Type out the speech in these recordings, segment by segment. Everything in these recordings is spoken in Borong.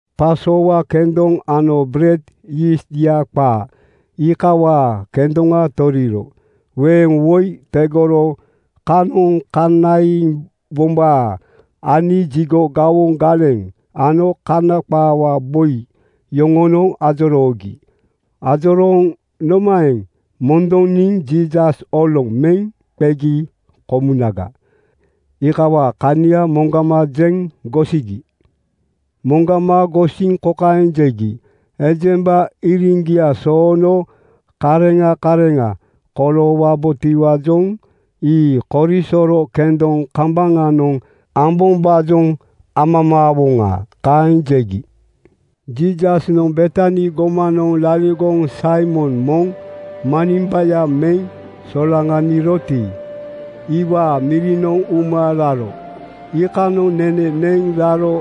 Pasowa kendoŋ ano bered yiistya qaa iikawaa kendoŋa toriri. Weeŋ woi tegoro kanoŋ kanaiwombaa ani jigo gawoŋ galeŋ ano Kana qaawaa boi yoŋonoŋ ajoroogi. Ajorooŋ nomaeŋ mondoniŋ Jiisas oloŋ meŋ qegi komunaga, iikawaa kania moŋgama jeŋ gosigi. Moŋgama gosiŋ kokaeŋ jegi, “Ejemba iriŋgia soono kareŋa kareŋa koloowabotiwaajoŋ ii korisoro kendoŋ kambaŋanoŋ ambombaajoŋ amamaawoŋa.” Kaeŋ jegi. Jiisasnoŋ Betani gomanoŋ laligoŋ Saimon moŋ manimbaya meŋ solaŋaniroti, iwaa mirinoŋ uma raro. Iikanoŋ nene neŋ raro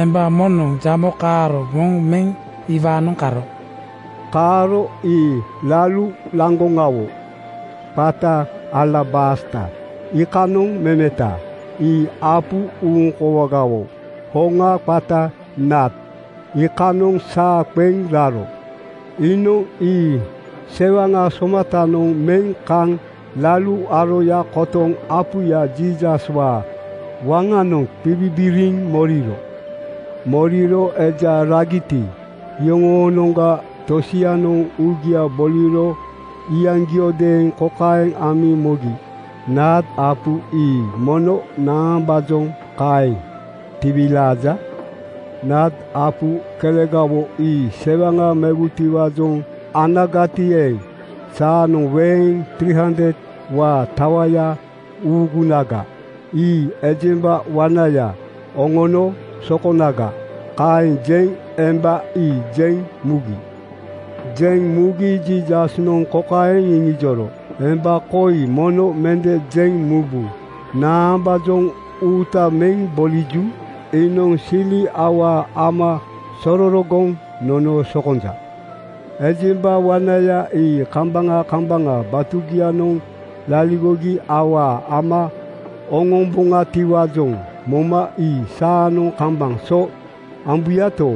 emba moŋnoŋ jamo kaaro moŋ meŋ iwaanoŋ karo. Kaaro ii lalu laŋgoŋawo qata alabasta iikanoŋ memeta. Ii apu uŋkoowagawo hoŋa qata naad iikanoŋ saa qeŋ raro. Iinoŋ ii sewaŋa somatanoŋ meŋ kaŋ lalu aroya kotoŋ apuya Jiisaswaa waŋanoŋ qibibiriŋ moriro. Moriro eja ragiti, iyoŋoonoŋga tosianoŋ uugia boliro iyaŋgiodeeŋ kokaeŋ amiŋ mogi, “Naad apu ii mono naambaajoŋ kaeŋ tiwilaaja? Naad apu kelegawo ii sewaŋa mewutiwaajoŋ anagati eeŋ, saanoŋ weeŋ 300:waa tawaya uugunaga. Ii ejemba wanaya oŋono sokonaga.” Kaeŋ jeŋ emba ii jeŋ mugi. Jeŋ mugi Jiisasnoŋ kokaeŋ iŋijoro, “Emba koi mono mende jeŋ mubu. Naambaajoŋ uuta meŋ boliju? Iinoŋ sili awaa ama sororogoŋ nono sokonja. Ejemba wanaya ii kambaŋa kambaŋa batugianoŋ laligogi awaa ama oŋomboŋatiwaajoŋ moma ii saanoŋ kambaŋ so ambuyato,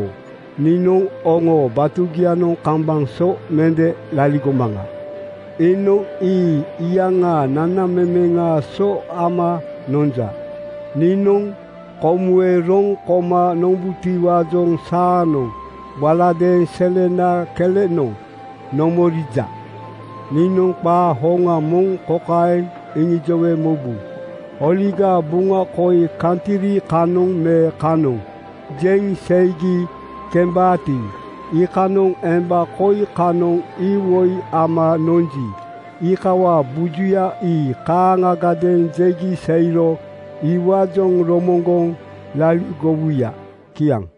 niinoŋ oŋoo batugianoŋ kambaŋ so mende laligomaŋa. Iinoŋ ii iyaŋaa nanamemeŋaa so ama nonja. Niinoŋ komuwe roŋ koma nombutiwaajoŋ saanoŋ waladeeŋ selena kelenoŋ nomorija. Niinoŋ qaa hoŋa moŋ kokaeŋ iŋijowe mobu: Oligaa Buŋa koi kantri kanoŋ me kanoŋ jeŋ seigi kembaati, iikanoŋ emba koi kanoŋ iwoi ama nonji, iikawaa bujuya ii kaaŋgadeeŋ jegi seiro iwaajoŋ romoŋgoŋ laligowuya.” Kiaŋ.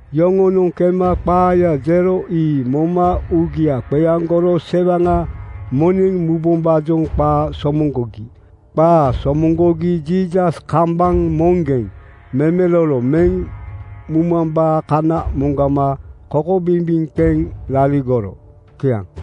Yoŋoonoŋ kema qaaya jero ii moma uugia qeaŋgoro sewaŋa moneŋ mubombaajoŋ qaa somoŋgogi. Qaa somoŋgogi Jiisas kambaŋ moŋgeŋ memelolo meŋ mumambaa kana moŋgama kokobimbiŋ qeŋ laligoro. Kiaŋ.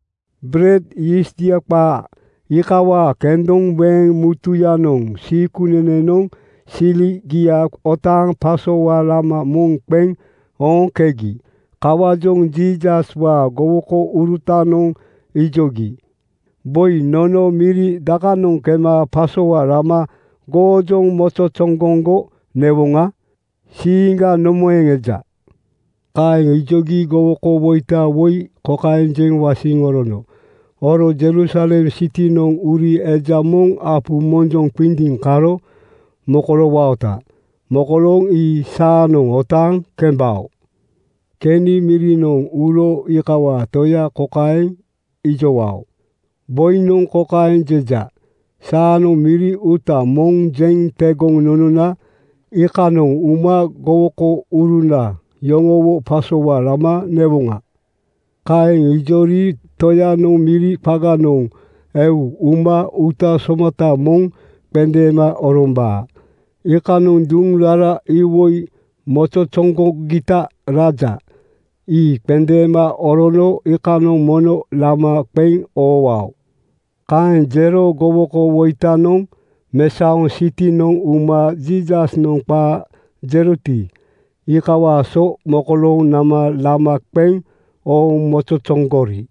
Bered yiistya qaa iikawaa kendoŋ weeŋ mutuyanoŋ (Siikunenenoŋ) siligia otaaŋ pasowa lama moŋ qeŋ ooŋkegi. Kawaajoŋ Jiisaswaa gowokourutanoŋ ijogi, “Boi, nono miri dakanoŋ kema pasowa lama goojoŋ mozozoŋgoŋgo newoŋa? Siiŋga nomaeŋ eja?” Kaeŋ ijogi gowokowoita woi kokaeŋ jeŋ wasiŋ orono, “Oro Jerusalem sitinoŋ uri eja moŋ apu monjoŋ qindiiŋ karo mokoloowaota. Mokolooŋ ii saanoŋ otaaŋ kembao. Keni mirinoŋ uro iikawaa toya kokaeŋ ijowao, ‘Boinoŋ kokaeŋ jeja: Saanoŋ miri uuta moŋ jeŋ tegoŋ nonona iikanoŋ uma gowokouruna yoŋowo pasowa lama newoŋa.’ Kaeŋ ijori toyanoŋ miri qaganoŋ eu uma uuta somata moŋ qendeema orombaa. Iikanoŋ duŋ rara iwoi mozozoŋgogita raja. Ii qendeema orono iikanoŋ mono lama qeŋ oowao.” Kaeŋ jero gowokowoitanoŋ mesaoŋ sitinoŋ uma Jiisasnoŋ qaa jeroti, iikawaa so mokolooŋ nama lama qeŋ ooŋ mozozoŋgori.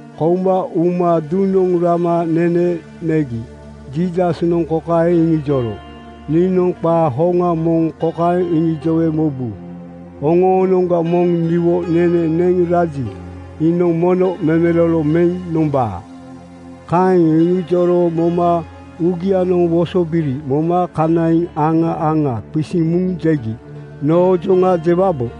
Kouma uma duŋnoŋ rama nene negi Jiisasnoŋ kokaeŋ iŋijoro, “Niinoŋ qaa hoŋa moŋ kokaeŋ iŋijowe mobu: Oŋoonoŋga moŋ niwo nene neŋ raji, iinoŋ mono memelolo meŋ nombaa.” Kaeŋ iŋijoro moma uugianoŋ wosobiri moma kanaiŋ aŋa aŋa qisiŋ muŋ jegi, “Noojoŋa jewabo?”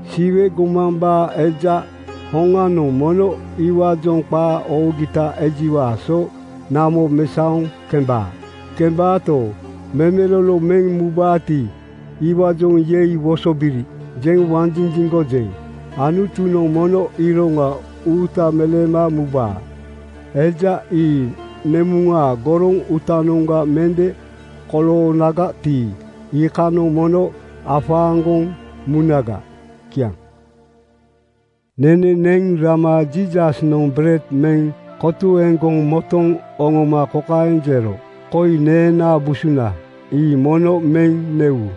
Siwe gomambaa Eja hoŋanoŋ mono iwaajoŋ qaa oogita ejiwaa so namo mesaoŋ kembaa. Kembaato, memelolo meŋ mubaati, iwaajoŋ ‘Yei wosobiri!’ jeŋ wanjinjiŋgojeŋ. Anutunoŋ mono iroŋa uuta meleema mubaa. Eja ii nemuŋaa goroŋ uutanoŋga mende koloonagati, iikanoŋ mono afaaŋgoŋ munaga.” Kiaŋ. Nene neŋ rama Jiisasnoŋ bered meŋ kotuegoŋ motoŋ oŋoma kokaeŋ jero, “Koi neenaa busuna. Ii mono meŋ newu.”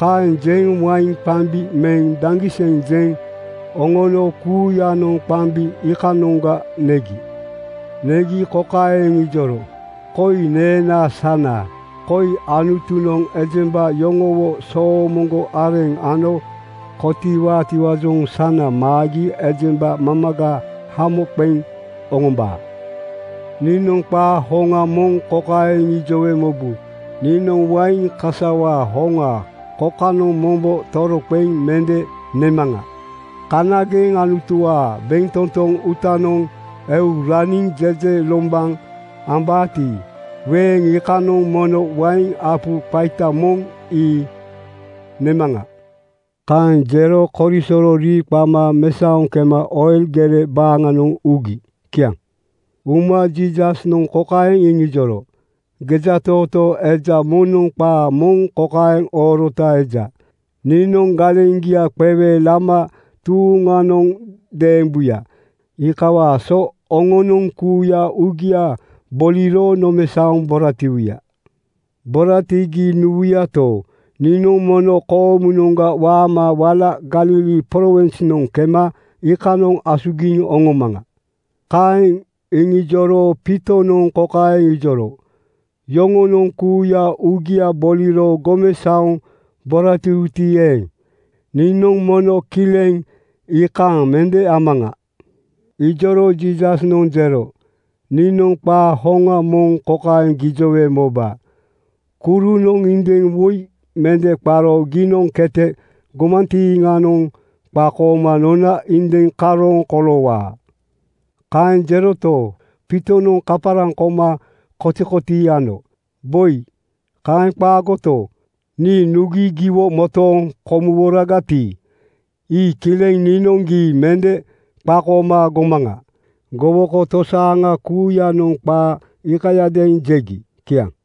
Kaeŋ jeŋ wain qambi meŋ daŋgiseŋ jeŋ oŋono kuuyanoŋ qambi iikanoŋga negi. Negi kokaeŋ iŋijoro, “Koi neenaa sana. Koi Anutunoŋ ejemba yoŋowo soomoŋgo areŋ ano kotiiwaatiwaajoŋ sana maagi ejemba mamaga hamo qeŋ oŋombaa. Niinoŋ qaa hoŋa moŋ kokaeŋ iŋijowe mobu: Niinoŋ wain kasawaa hoŋa kokanoŋ mombo toroqeŋ mende nemaŋa. Kanageŋ Anutuwaa bentotoŋ uutanoŋ eu raniŋ jejelombaŋ ambaati, weeŋ iikanoŋ mono wain apu qaita moŋ ii nemaŋa.” Kaeŋ jero korisoro rii qama mesaoŋ kema Oil gere baaŋanoŋ ugi. Kiaŋ. Uma Jiisasnoŋ kokaeŋ iŋijoro, “Gejatootoo eja moŋnoŋ qaa moŋ kokaeŋ oorota eja, ‘Niinoŋ galeŋgia qewe lama tuuŋanoŋ deembuya.’ Iikawaa so oŋonoŋ kuuya uugia boliro nomesaoŋ boratiwuya. Boratigi nuwuyato, niinoŋ mono koomunoŋga waama wala Galili prowinsnoŋ kema iikanoŋ asugiŋ oŋomaŋa.” Kaeŋ iŋijoro Piitonoŋ kokaeŋ ijoro, “Yoŋonoŋ kuuya uugia boliro gomesaoŋ boratiwuti eeŋ, niinoŋ mono kileŋ iikaaŋ mende amaŋa.” Ijoro Jiisasnoŋ jero, “Niinoŋ qaa hoŋa moŋ kokaeŋ gijowe moba: Kurunoŋ indiŋ woi mende qaro giinoŋ kete gomantiiŋanoŋ qakooma nona indiŋ karooŋ koloowaa.” Kaeŋ jeroto, Piitonoŋ kaparaŋ koma kotikotii ano, “Boi, kaeŋ qaagoto, nii nugi giwo motooŋ komuworagati, ii kileŋ niinoŋ gii mende qakooma gomaŋa.” Gowoko tosaaŋa kuuyanoŋ qaa iikayadeeŋ jegi. Kiaŋ.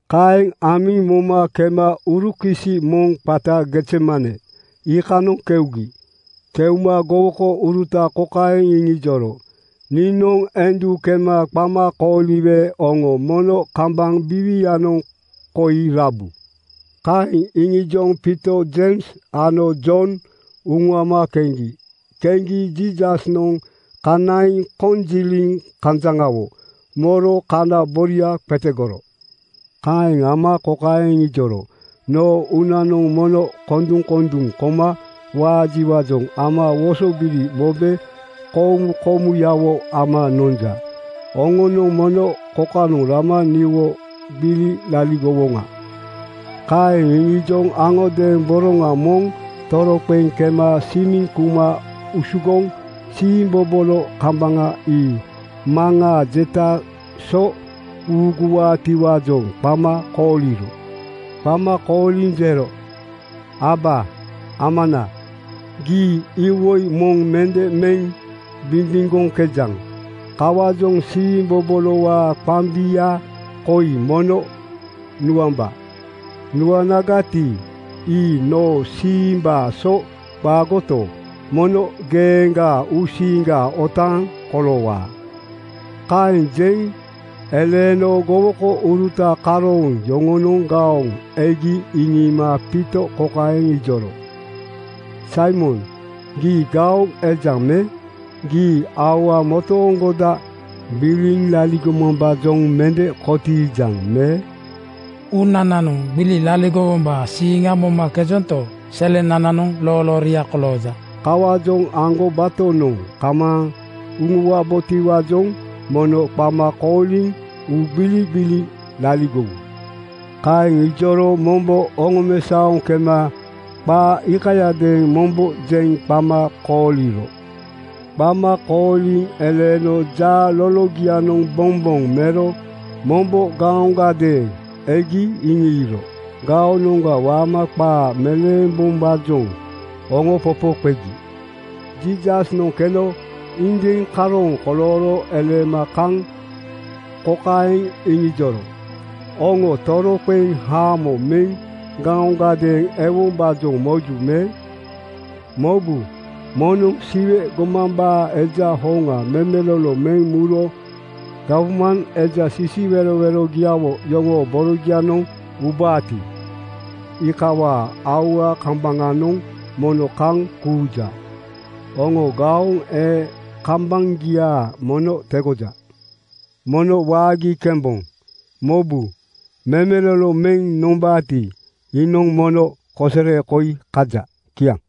Kaeŋ amiŋ moma kema urukisi moŋ qata Gezemane iikanoŋ keugi. Keuma gowokouruta kokaeŋ iŋijoro, “Niinoŋ endu kema qama kooliwe oŋo mono kambaŋ biiwianoŋ koi rabu.” Kaeŋ iŋijoŋ Piito, Jeims ano Jon uŋuama keŋgi. Keŋgi Jiisasnoŋ kanaiŋ konjiliŋ kanjaŋawo moro kana boria qetegoro. Kaeŋ ama kokaeŋ iŋijoro, “Noo uunanoŋ mono konduŋkonduŋ koma waajiwaajoŋ ama wosobiri mobe komukomuyawo ama nonja. Oŋonoŋ mono kokanoŋ rama niwo gbili laligowoŋa.” Kaeŋ iŋijoŋ aŋodeeŋ boroŋa moŋ toroqeŋ kema simiŋ kuma usugoŋ siimbobolo kambaŋa ii Maŋaa jetaa so uuguwaatiwaajoŋ qama kooliro. Qama kooliŋ jero, “Aba Amana, gii iwoi moŋ mende meŋ bimbiŋgoŋkejaŋ. Kawaajoŋ siimbobolowaa qambia koi mono nuamba. Nuanagati, ii noo siimbaa so qaagoto, mono geeŋgaa uusiiŋga otaaŋ koloowa.” Kaeŋ jeŋ eleeno gowokouruta karooŋ yoŋonoŋ gaoŋ egi iŋiima Piito kokaeŋ ijoro, “Saimon, gii gaoŋ ejaŋ me? Gii aua motooŋgoda gbili laligomambaajoŋ mende kotiijaŋ me? Uunananoŋ gbili laligowombaa siiŋa momakejonto, selenananoŋ loolooria kolooja. Kawaajoŋ aŋgobatonoŋ kamaaŋ uŋuwabotiwaajoŋ mono qama kooliŋ uugbiligbili laligowu.” Kaeŋ ijoro mombo oŋomesaoŋ kema qaa iikayadeeŋ mombo jeŋ qama kooliro. Qama kooliŋ eleeno jaa lologia bomboŋ mero mombo gaoŋgadeeŋ egi iŋiiro. Gaonoŋga waama qaa meleembom-baajoŋ oŋopopo qegi. Jiisasnoŋ keno indiŋ karooŋ kolooro eleema kaŋ kokaeŋ iŋijoro, “Oŋo toroqeŋ haamo meŋ gaoŋgadeeŋ ewombaajoŋ moju me? Mobu! Moŋnoŋ Siwe gomambaa Eja hoŋa memelolo meŋ muro gawman eja sisiwerowerogiawo yoŋoo borogianoŋ ubaati, iikawaa aua kambaŋanoŋ mono kaŋ kuuja. Oŋoo gaoŋ ee kambaŋgia mono tegoja. Mono waagi kemboŋ. Mobu! Memelolo meŋ nombaati, iinoŋ mono kosere koi kaja.” Kiaŋ.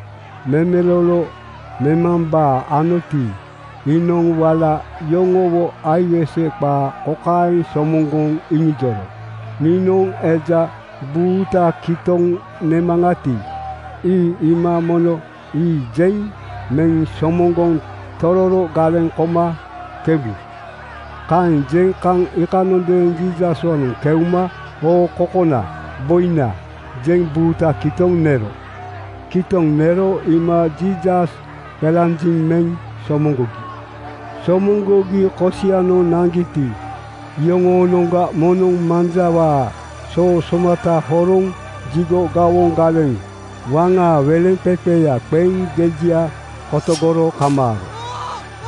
Memelolo memambaa anoti, iinoŋ wala yoŋowo aiwese qaa kokaeŋ somoŋgoŋ iŋijoro, “Niinoŋ eja buuta kitoŋ nemaŋati, ii iima ‘Mono ii!’ jeŋ meŋ somoŋgoŋ tororo galeŋ koma kembu.” Kaeŋ jeŋ kaŋ iikanondeeŋ Jiisaswaanoŋ keuma “Oo kokona! (Boina!)” jeŋ buuta kitoŋ nero. Kitoŋ nero iima Jiisas qelanjiŋ meŋ somoŋgogi. Somoŋgogi kosianoŋ naŋgiti, iyoŋoonoŋga moŋnoŋ manjawaa soo somata horoŋ jigo gawoŋ galeŋ waŋaa weleŋqeqeya qeŋ gejia kotogoro kamaaro.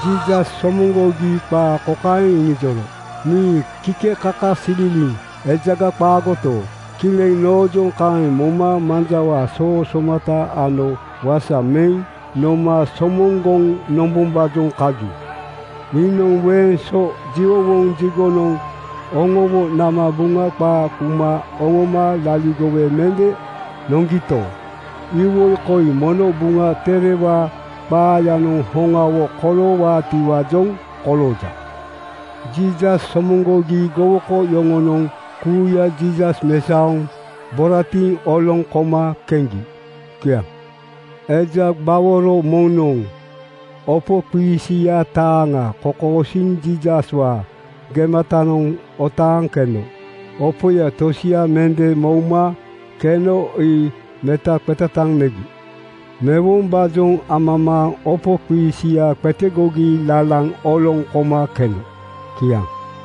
Jiisas somoŋgogi qaa kokaeŋ iŋijoro, “Nii kikekakasililiŋ ejaga qaagoto, kileŋ noojoŋ kaeŋ moma manjawaa soo somata ano wasa meŋ noma somoŋgoŋ nombombaajoŋ kaju. Niinoŋ weeŋ so jiwowoŋ jigonoŋ oŋowo nama Buŋa qaa kuma oŋoma laligowe mende noŋgito, iwoi koi mono Buŋa Terewaa qaayanoŋ hoŋawo koloowaatiwaajoŋ kolooja. Jiisas somoŋgogi gowoko yoŋonoŋ kuuya Jiisas mesaoŋ boratiŋ oloŋ koma keŋgi. Kiaŋ. Eja gbaworo moŋnoŋ opoqiisia taaŋa kokosiiŋ Jiisaswaa gematanoŋ otaaŋ keno. Opoya tosia mende mouma keno ii metaqetataŋ megi. Mewombaajoŋ amamaaŋ opoqiisia qetegogi lalaŋ oloŋ koma keno. Kiaŋ.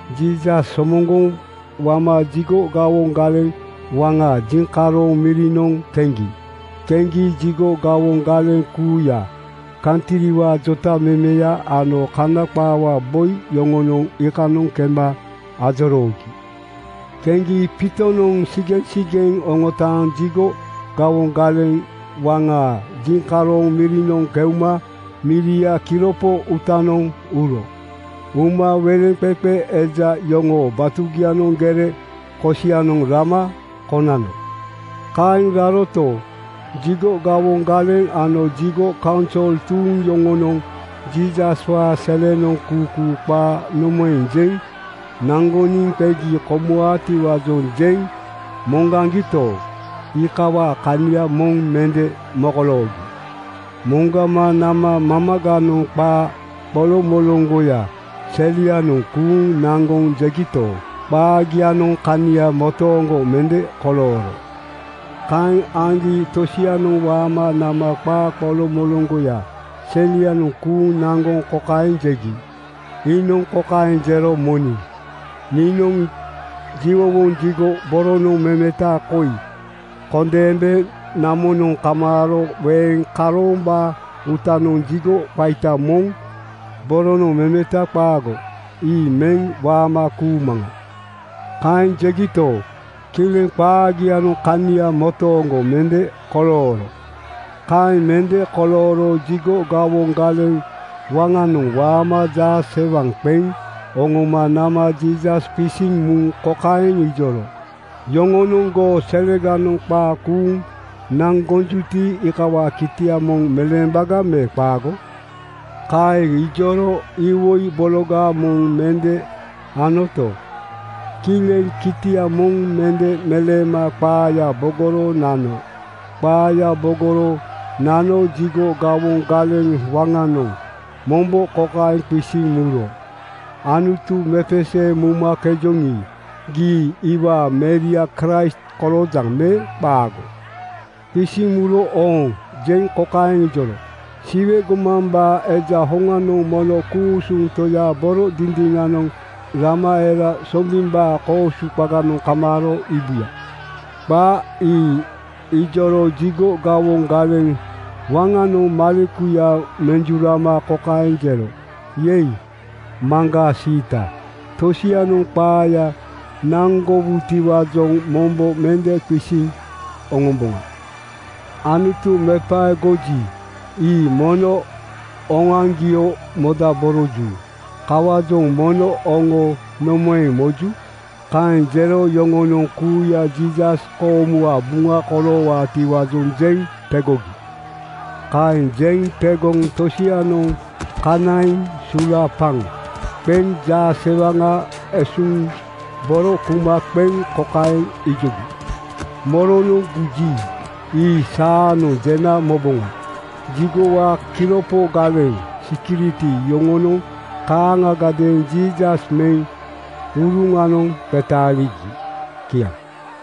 Jiisas somoŋgoŋ wama jigo gawoŋ galeŋ waŋaa jiŋkaroŋ mirinoŋ keŋgi. Keŋgi jigo gawoŋ galeŋ kuuya, kantriwaa jotamemeya ano Kana qaawaa boi yoŋonoŋ iikanoŋ kema ajoroogi. Keŋgi Piitonoŋ sigeŋsigeŋ oŋotaaŋ jigo gawoŋ galeŋ waŋaa jiŋkaroŋ mirinoŋ keuma miriaa kiropo uutanoŋ uro. Uma weleŋqeqe eja yoŋoo batugianoŋ gere kosianoŋ rama konano. Kaeŋ raroto, jigo gawoŋ galeŋ ano jigo kaunsol tuuŋ yoŋonoŋ Jiisaswaa selenoŋ kuukuu qaa nomaeŋ jeŋ naŋgoniŋ qegi komuwaatiwaajoŋ jeŋ moŋgaŋgito, iikawaa kania moŋ mende mokoloogi. Moŋgama nama mamaganoŋ qaa qoloŋmoloŋgoya selianoŋ kuuŋ naŋgoŋ jegito, qaagianoŋ kania motooŋgo mende kolooro. Kaeŋ aŋgi tosianoŋ waama nama qaa qoloŋmoloŋgoya selianoŋ kuuŋ naŋgoŋ kokaeŋ jegi, “Iinoŋ kokaeŋ jero moniŋ, ‘Niinoŋ jiwowoŋ jigo boronoŋ memeta koi kondeembe namonoŋ kamaaro weeŋ karoombaa uutanoŋ jigo qaita moŋ boronoŋ memeta qaago ii meŋ waama kuumaŋa.” ’ Kaeŋ jegito, kileŋ qaagianoŋ kania motooŋgo mende kolooro. Kaeŋ mende kolooro jigo gawoŋ galeŋ waŋanoŋ waama jaasewaŋ qeŋ oŋoma nama Jiisas qisiŋ muŋ kokaeŋ ijoro, “Yoŋonoŋ goo seleganoŋ qaa kuuŋ naŋgojuti, iikawaa kitia moŋ jewaga me qaago?” Kaeŋ ijoro iwoi bologa moŋ mende anoto, kileŋ kitia moŋ mende meleema qaaya bogoro nano. Qaaya bogoro nano jigo gawoŋ galeŋ waŋanoŋ mombo kokaeŋ qisiŋ muro, “Anutu mepeseeŋ mumakejoŋi, gii iwaa Meria Kraist koloojaŋ me qaago?” Qisiŋ muro “Ooŋ” jeŋ kokaeŋ iŋijoro, “Siwe gomambaa Eja hoŋanoŋ mono ku-usuŋ Toyaa boro dindiŋanoŋ rama era sombimbaa koosu qaganoŋ kamaaro iibuya.” Qaa ii iŋijoro jigo gawoŋ galeŋ waŋanoŋ malekuya menjurama kokaeŋ jero, “Yei, maŋgaa siita! Tosianoŋ qaaya naŋgowutiwaajoŋ mombo mende qisiŋ oŋomboŋa. Anutu mepaegoji, ii mono oŋoaŋgio modaboroju. Kawaajoŋ mono oŋo nomaeŋ moju?” Kaeŋ jero yoŋonoŋ kuuya Jiisas koomuwaa buŋa koloowaatiwaajoŋ jeŋ tegogi. Kaeŋ jeŋ tegoŋ tosianoŋ kanaiŋ sulaapaŋ qeŋ jaasewaŋa esuuŋ boro kuma qeŋ kokaeŋ ijogi, “Moronoŋ guji, ii saanoŋ jena moboŋa.” Jigowaa kiropo galeŋ (sikiriti) yoŋonoŋ kaaŋagadeeŋ Jiisas meŋ uruŋanoŋ qetaaligi. Kiaŋ.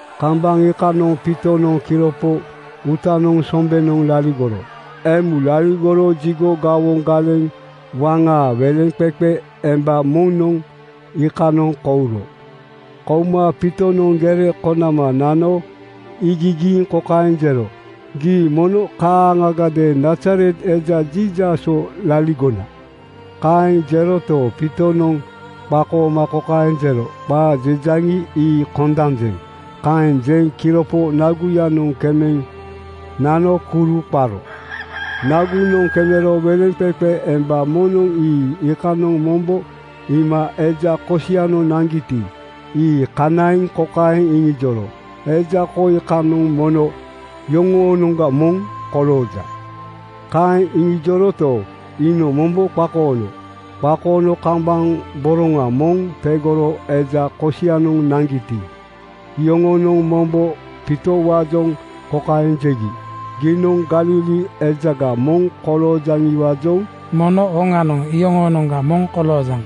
Kambaŋ iikanoŋ Piitonoŋ kiropo uutanoŋ sombenoŋ laligoro. Emu laligoro jigo gawoŋ galeŋ waŋaa weleŋqeqe emba moŋnoŋ iikanoŋ kouro. Kouma Piitonoŋ gere konama nano iigigiiŋ kokaeŋ jero, “Gii mono kaaŋagadeeŋ Nazaret eja Jiisaswo laligona.” Kaeŋ jeroto, Piitonoŋ qakooma kokaeŋ jero, “Qaa jejaŋi, ii kondanjeŋ.” Kaeŋ jeŋ kiropo naguyanoŋ kemeŋ nano kuru qaro. Nagunoŋ kemero weleŋqeqe emba moŋnoŋ ii iikanoŋ mombo iima eja kosianoŋ naŋgiti, ii kanaiŋ kokaeŋ iŋijoro, “Eja koi kanoŋ mono yoŋoonoŋga moŋ kolooja.” Kaeŋ iŋijoroto, iinoŋ mombo qakoono. Qakoono kambaŋ boroŋa moŋ tegoro eja kosianoŋ naŋgiti, iyoŋonoŋ mombo Piitowaajoŋ kokaeŋ jegi, “Giinoŋ Galili ejaga moŋ koloojaŋiwaajoŋ mono hoŋanoŋ iyoŋoonoŋga moŋ koloojaŋ.”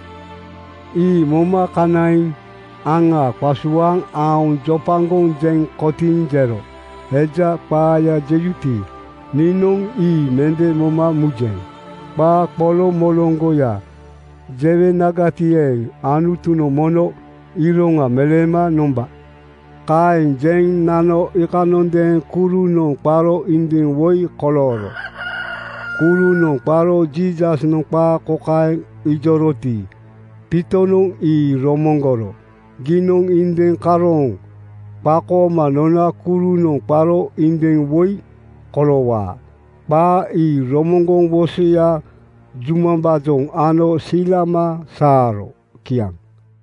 Ii moma kanaiŋ aŋa qasuaaŋ aoŋ jopaŋgoŋ jeŋ kotiiŋ jero, “Eja qaaya jejuti, niinoŋ ii mende moma mujeŋ. Qaa qoloŋ-moloŋgoya jewenagati eeŋ, Anutunoŋ mono iroŋa meleema nomba.” Kaeŋ jeŋ nano iikanondeeŋ kurunoŋ qaro indiŋ woi kolooro. Kurunoŋ qaro Jiisasnoŋ qaa kokaeŋ ijoroti, Piitonoŋ ii romoŋgoro, “Giinoŋ indiŋ karooŋ qakooma nona kurunoŋ qaro indiŋ woi koloowaa.” Qaa ii romoŋgoŋ wosoya jumambaajoŋ ano silama saaro. Kiaŋ.